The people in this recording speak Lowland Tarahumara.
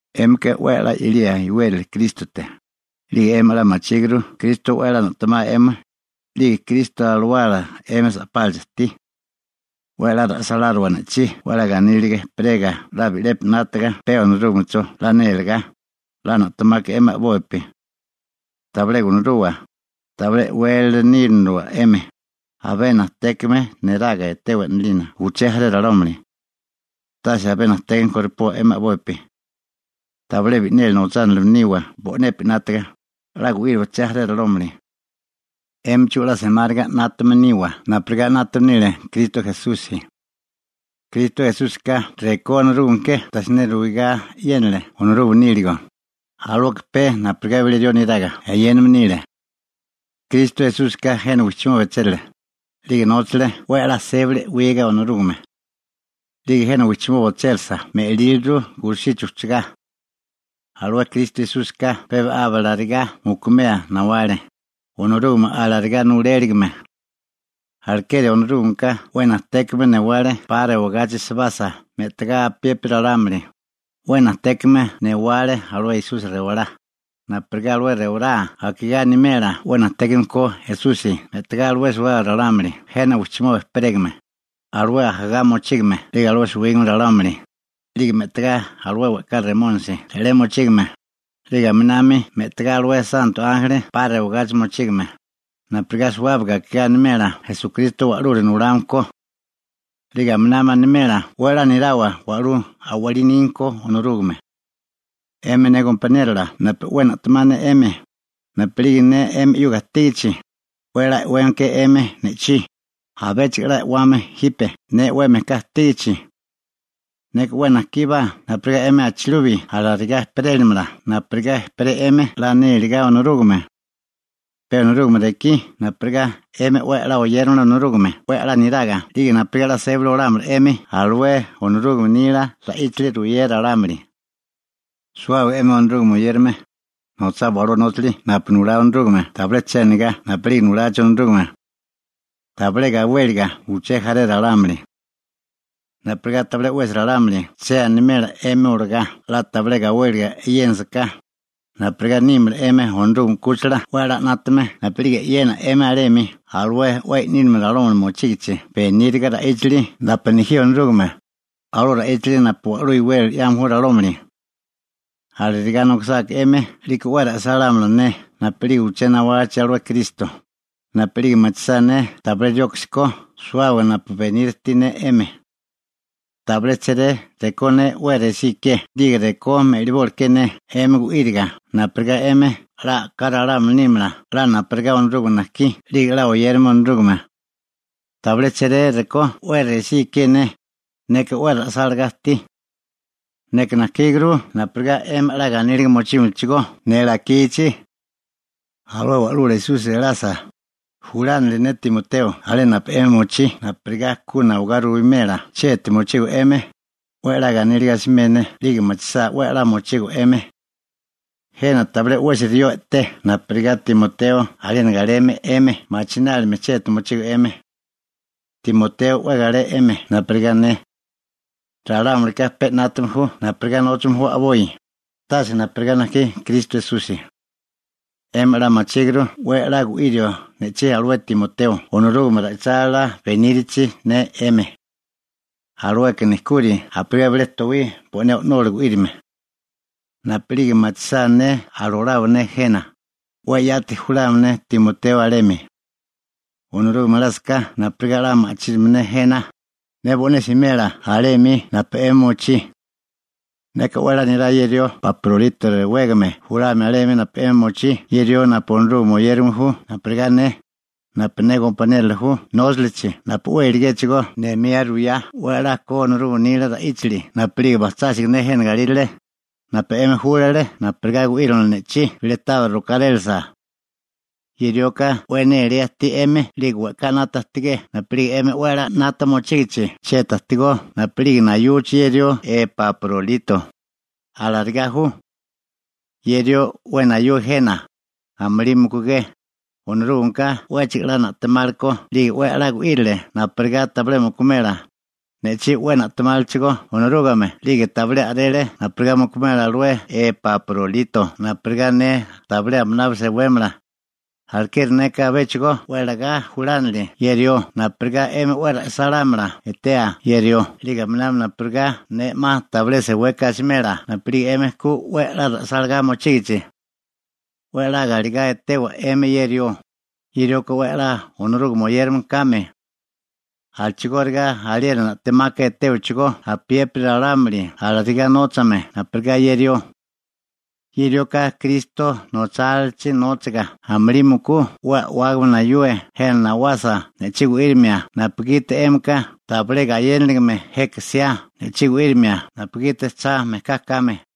'Émika 'we 'la 'yalía iwérali Krístote, 'lige 'emi 'la machíguru Kristo 'we 'la na'temao 'emi, 'lige Kristo Alawala 'emi sa'pálachi ajtí. 'We 'la ra'sáláriwa ne'chí 'la ganíliga ejperega 'la bi'lepi 'nátaga pe Onorúgamecho 'la nélegá, 'la na'temaka 'emi a'bopi. Tabilé gunuruwa, tabilé e'wélala níniliwa 'emi, abé najtékame neraga etewa 'nalina uché jaré ralámuli. Tase abé najtékame koripoa 'emi a'bopi. Tabilé bi'neli nochánilime niwa bo'nepi 'nátaga, 'la gu'íriwa uché jaré ralámuli. 'Émichigó 'la semáriga 'nátame niwa napurigá 'nátame nile Kristo Esusi. Kristo Esúsika rekó Onorúgame ke tabilé siné ruigá eyénale Onorúgame níligo, alueka pe napurigá bilé rió neraga eyéname nile. Kristo Esúsika jena wijchimoba ochérale, 'lige nóchale 'we 'la sébali e'wiga Onorúgame. 'Lige jena wijchimoba ochérisa me'líliru gulusichi ujchugá. Alué Kristo Esúsika pe aba alarigá mukumea nawale, Onorúgame alarigá nuléligime. Alekeri Onorúgameka 'we najtékame newale 'pa rewagachi sebasa me'tagá apiépiri ralámuli, 'we najtékame newale alué Esusi rewalá, napurigá alué rewalá akigá animela 'we najtékame ko Esusi me'tagá alué suwábaga ralámuli jena wijchimoba ejperégame, alué ajagá mochígame 'lige alué suwígame ralámuli, 'lige me'tagá alué we'ká remónisi re'lé mochígame, 'lige aminami me'tagá alué santo ánjeli 'pa rewagachi mochígame, napurigá suwábaga akigá animela Esukristo Wa'lula Nulame ko. 'Lige aminami animela 'we 'la nirawa wa'lú a'walí nígame ko Onorúgame. 'Emi ne gompaniérola napu 'we na'temá ne 'emi, napu'lige ne 'emi 'yuga ajtígachi, 'we a'lá e'weme ke 'emi ne'chí. Abéchigo 'la e'wawa jipe ne 'we mejká ajtígichi. Neka 'we najkíbá napurigá 'emi abichilubi alarigá ejperélamala napurigá ejperé 'emi 'we 'la nélegá Onorúgame. Pe Onorúgame rekí napurigá 'emi 'we 'la oyéramala Onorúgame 'we 'la niraga 'lige napurigá 'la sébali olámala 'emi alué Onorúgame nila ra'íchali ruyea ralámuli. Suwábaga 'emi Onorúgame oyérame, nochawa alué nóchali napu nulá Onorúgame tabilé che anigá napu'lige nulachi Onorúgame, tabilé gawéliga uché jaré ralámuli, napurigá tabilé 'wesi ralámuli che animela 'emi olagá 'la tabilé gawéliga e'yénasaká, napurigá nímala 'emi Onorúgame 'kúchila 'we a'lá 'nátame napu'lige e'yena 'emi alemi alué 'we i'nílame ralámuli mochígichi beníriga ra'íchali napu nejí Onorúgame, alué ra'íchali napu wa'lú iwérali 'yame ju ralámuli. Alarigá nokisáká 'emi 'liko 'we ra'sálámala ne napu'lige uché nawachi alué Kristo, napu'lige machisá ne tabilé rioksi ko suwábaga napu beniria ajtí ne 'emi. Tabilé chéré rekó ne 'we resí ikié 'lige rekó me'liboli ke ne 'emi gu'íriga napurigá 'emi 'la a'ká ralámuli nímala 'la napurigá Onorúgame najkí 'lige 'la oyérame Onorúgame. Tabilé chéré rekó 'we resí ikié ne, neka 'we ra'sálagá ajtí. Neka najkíguru napurigá 'emi 'la ganíliga mochímalachigó ne lakichi. Alué Wa'lula Esusi elasa, julánili ne Timoteo alé napu 'emi mochí napurigá ku nawagá ruwimela chieti mochigo 'emi, 'we 'la ganíliga asimé ne 'lige machisá 'we 'la mochigo 'emi. Jena tabilé 'wesi rió i'té napurigá Timoteo aliena galeme 'emi machinálime chieti mochigo 'emi. Timoteo 'we galé 'emi napurigá ne. Ralámulika pe 'nátame ju napurigá nóchame ju a'boi, tase napurigá najkí Kristo Esusi. 'Emi 'la machíguru 'we 'la gu'irio ne'chí alué Timoteo Onorúgame ra'ichálila benírichi ne 'emi. Alueka nejkuri napurigá bilé towí bo'né o'nola gu'írime. Napu'lige machisá ne alolabo ne jena, 'we yati julámala ne Timoteo alemi. Onorúgame elásaká napurigá 'la ma'chínamala ne jena, ne bo'né simela alé 'mi napu 'emi mochí. Neka 'we 'la nirá ye rió Epaprolito rewégame julamia alemi napu 'emi mochí, ye rió napu Onorúgame oyérame ju napurigá ne, napu ne gompaniérola ju nóchalichi napu 'we iligéchigó nemía ruyá 'we a'lá ko Onorúgame nila ra'íchali napu'lige bajchásiga ne jena galírale, napu 'emi júlale napurigá gu'írimala ne'chí bilé tabiri rokárélasa. Ye rioka 'we néléa ajtí 'emi 'lige we'ká 'nata ajtigé napu'lige 'emi 'we 'nata mochígichi chieti ajtigó napu'lige nayuchi ye rió Epaprolito. Alarigá ju. Ye rió 'we nayue jena, amulí mukugé, Onorúgameka 'wéchigo 'la na'temale ko 'lige 'we 'la gu'írile napurigá tabilé mukumela, ne'chí 'we na'temálechigó Onorúgame 'lige tabilé a'rele napurigá mukumela alué Epaprolito napurigá ne tabilé aminabi sewémala. Alekeri neka abéchigo 'we lagá julánili ye rió napurigá 'emi 'we ra'sálámala etea ye rió 'lige aminami napurigá ne 'ma tabilé seweka asimela napu'lige 'emi ku 'we 'la ra'sálagá mochígichi. 'We 'la galegá etewa 'emi ye rió, ye rioka 'we 'la Onorúgame oyérame kame. A'chigóriga aliena na'temaka etéwachigó apiépiri ralámuli alarigá nóchame napurigá ye rió. Ye rioka Kristo nochálalachi nóchaga amulí mukú 'we a'wágame nayue jena nawasa ne'chí gu'írimia napugiti 'émika tabilé gayénaligime jeka jsiá ne'chí gu'írimia napugiti cha mejká kame.